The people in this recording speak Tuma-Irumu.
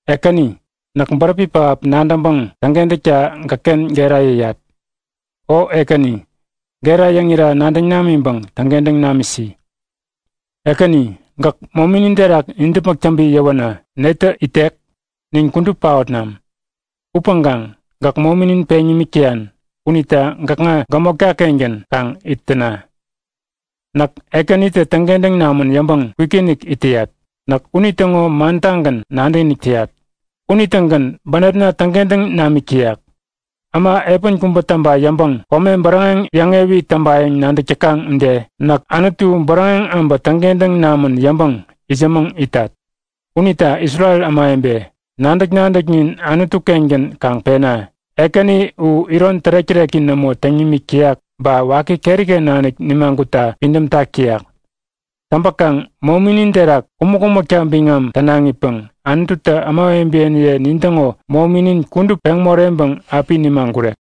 Ekäni, näk bäräpi pähap nadäŋpäŋ täŋkentäkta gäkken gera yäyat. O Ekäni, gera yäŋira nadäŋ namiŋpäŋ täŋkentäŋ namisi. Ekäni, gäk mominin terak nidäpmäk täŋpi yäwänä netä itek? Nin kudup paotnam. Upäŋkaŋ, gäk mominin peŋ nimik täyan unita gäkŋa gämotka-kengän kaŋ it täna. Näk Ekänitä täŋkentäŋ namän yäŋpäŋ kwikinik it täyat. Näk unitäŋo mantagän nadäkinik täyat. Unitägän bänepna täŋkentäŋ namik täyak. Äma epän kubä täŋpa yäŋpäŋ kome bäräŋeŋ yäŋewi täŋpayäŋ nadäk täkaŋ ude, näk Anutu bäräŋeŋ abä täŋkentäŋ namän yäŋpäŋ itsämäŋ itat. Unita Isrel ämawebe, nadäk-nadäknin Anutu-kengän kaŋ pena. Ekäni u iron tärek-täreki nämo täŋ nimik täyak ba waki keriken nanik nimagutta pidämtak täyak. Täŋpäkaŋ mominin terak kumäk-kumäkta biŋam tänaŋipäŋ Anututä ämawebeniye nintäŋo mominin kudup peŋ moreŋpäŋ api nimagurek.